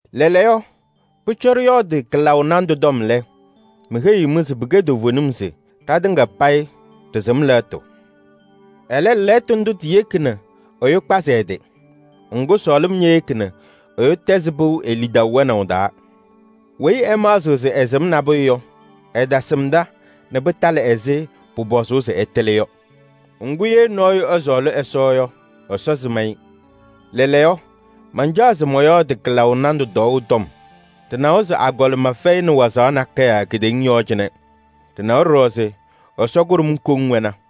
Lɛɛlɛɛyɔ, pʋcɔ ɖɩyɔɔdɩ kɩlaʋ nandʋ tɔm lɛ, meheyiɣ-mɩ se pɩkɛ toovenim se: “Ɖatɩŋa payɩ ɖɩsɩm lɛɣtʋ.” Ɛlɛ, lɛɣtʋ ndʋ tiyeki nɛ ɛyʋ kpazɩ ɛ-tɩ. Ŋgʋ, sɔɔlɩm ñeyeki nɛ ɛyʋ tɛzɩ pɩʋ e-lidaʋ wɛnaʋ taa. Weyi ɛmaɣzɩɣ se ɛsɩm nabʋyʋ yɔ, ɛtasɩmda nɛ pɩtalɩ ɛzɩ pʋpɔzʋʋ se ɛtɩlɩ yɔ. Ŋgʋ, ye nɔɔyʋ ɛsɔɔlɩ Ɛsɔ yɔ, Ɛsɔ sɩm-ɩ. Lɛɛlɛɛyɔ, mancaɣ se mɔyɔɔdɩ kɩlaʋ nandʋ tɔɔʋ tɔm. Ɖɩnawa se agɔlɩma fɛyɩnɩ wazaɣ nakɛyɛ kedeŋa yɔɔ cɩnɛ. Ɖɩnawa ɖɔɖɔ se Ɛsɔ kʋɖʋm koŋ wɛna.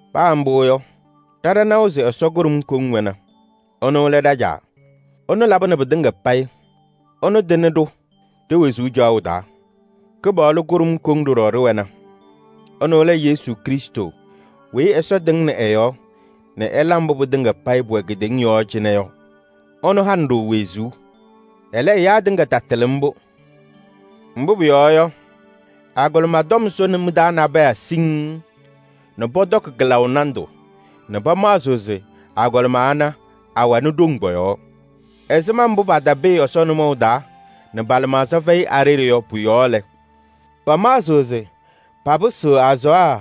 Paa mbʋ yɔ, ɖa ɖanawa se Ɛsɔ kʋɖʋm koŋ wɛna. Ɛnʋ lɛ ɖa-Caa. Ɛnʋ labɩnɩ pɩtɩŋa payɩ, ɛnʋ tɩnɩ-ɖʋ ɖe-wezuu caɣʋ taa. Kɩpaɣlʋ kʋɖʋm koŋ ɖɔɖɔ ɖɩwɛna. Ɛnʋ lɛ Yesu Krɩstʋ weyi Ɛsɔ tɩŋnɩ ɛ-yɔɔ nɛ ɛla mbʋ pɩtɩŋa payɩ pʋwɛ kedeŋa yɔɔ cɩnɛ yɔ. Ɛnʋ hanɩ-ɖʋ wezuu. Ɛlɛ, ɛyaa tɩŋa tatɩlɩ mbʋ. Mbʋ pʋyɔɔ yɔ, agɔlɩma tɔm sʋnɩ mɩ-taa nabɛyɛ siŋŋ nɛ pɔtɔkɩ kɩlaʋ nandʋ nɛ pamaɣzɩɣ se agɔlɩma ana awɛnɩ ɖoŋ pɔ-yɔɔ. Ɛzɩma mbʋ patapɩɩ Ɛsɔ nʋmɔʋ taa nɛ pa-lɩmaɣza fɛyɩ a-ɖeɖe lɛ, pamaɣzɩɣ se papɩsɩɣ azaɣa.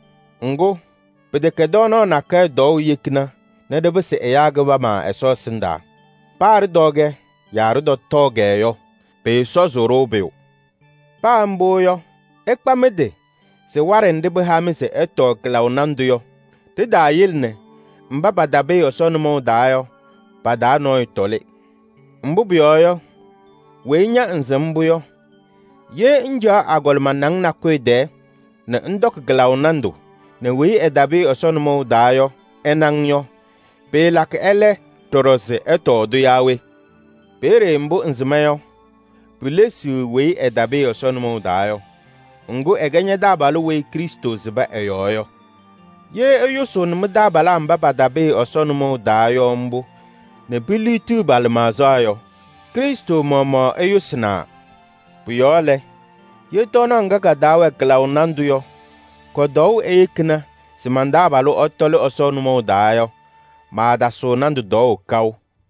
Ŋgʋ, pɩtɛkɛ tɔɔnaɣ nakɛyɛ tɔɔʋ yekina nɛ ɖɩpɩsɩ ɛyaa kɩbama Ɛsɔ ɛsɩndaa. Paa ɖɩtɔɔ-kɛ yaa ɖɩtɔtɔɔ-kɛ yɔ, pɩɩsɔzʋʋ-ɖʋ pʋyʋ. Paa mbʋ yɔ, ɩkpa mɩ-tɩ se waɖɛ nɖɩ pɩha-mɩ se ɩtɔɔ kɩlaʋ nandʋ yɔ, ɖitaayele nɛ mba patapɩɩ Ɛsɔ nʋmɔʋ taa yɔ, pa-taa nɔɔyʋ tɔlɩ. Mbʋ pʋyɔɔ yɔ, weyi ña ŋsɩm mbʋ yɔ, ye ŋcaɣ agɔlɩma naŋ nakʋyʋ tɛɛ nɛ ŋtɔkɩ kɩlaʋ nandʋ nɛ weyi ɛtapɩɩ Ɛsɔ nʋmɔʋ taa yɔ ɛna-ŋ yɔ, pɩɩlakɩ ɛlɛ ɖɔɖɔ se ɛtɔɔ-tʋ yaa we? Peeye mbʋ ŋsɩma yɔ, pilesiɣ weyi ɛtapɩɩ Ɛsɔ nʋmɔʋ taa yɔ. Ŋgʋ, ɛkɛ ña-taabalʋ weyi Krɩstʋ sɩbɩ ɛ-yɔɔ yɔ. Ye ɩyʋsʋʋnɩ mɩ-taabalaa mba patapɩɩ Ɛsɔ nʋmɔʋ taa yɔ mbʋ nɛ piliɣtiɣ pa-lɩmaɣza yɔ, Krɩstʋ maɣmaɣ ɩyʋsɩnaa. Pʋ-yɔɔ lɛ, ye tɔɔnaɣ ŋga ka-taa wɛ kɩlaʋ nandʋ yɔ kɔ-tɔɔʋ eyekina se man-taabalʋ ɛtɔlɩ Ɛsɔ nʋmɔʋ taa yɔ, maatasɩɣ nandʋ tɔɔʋ kaʋ.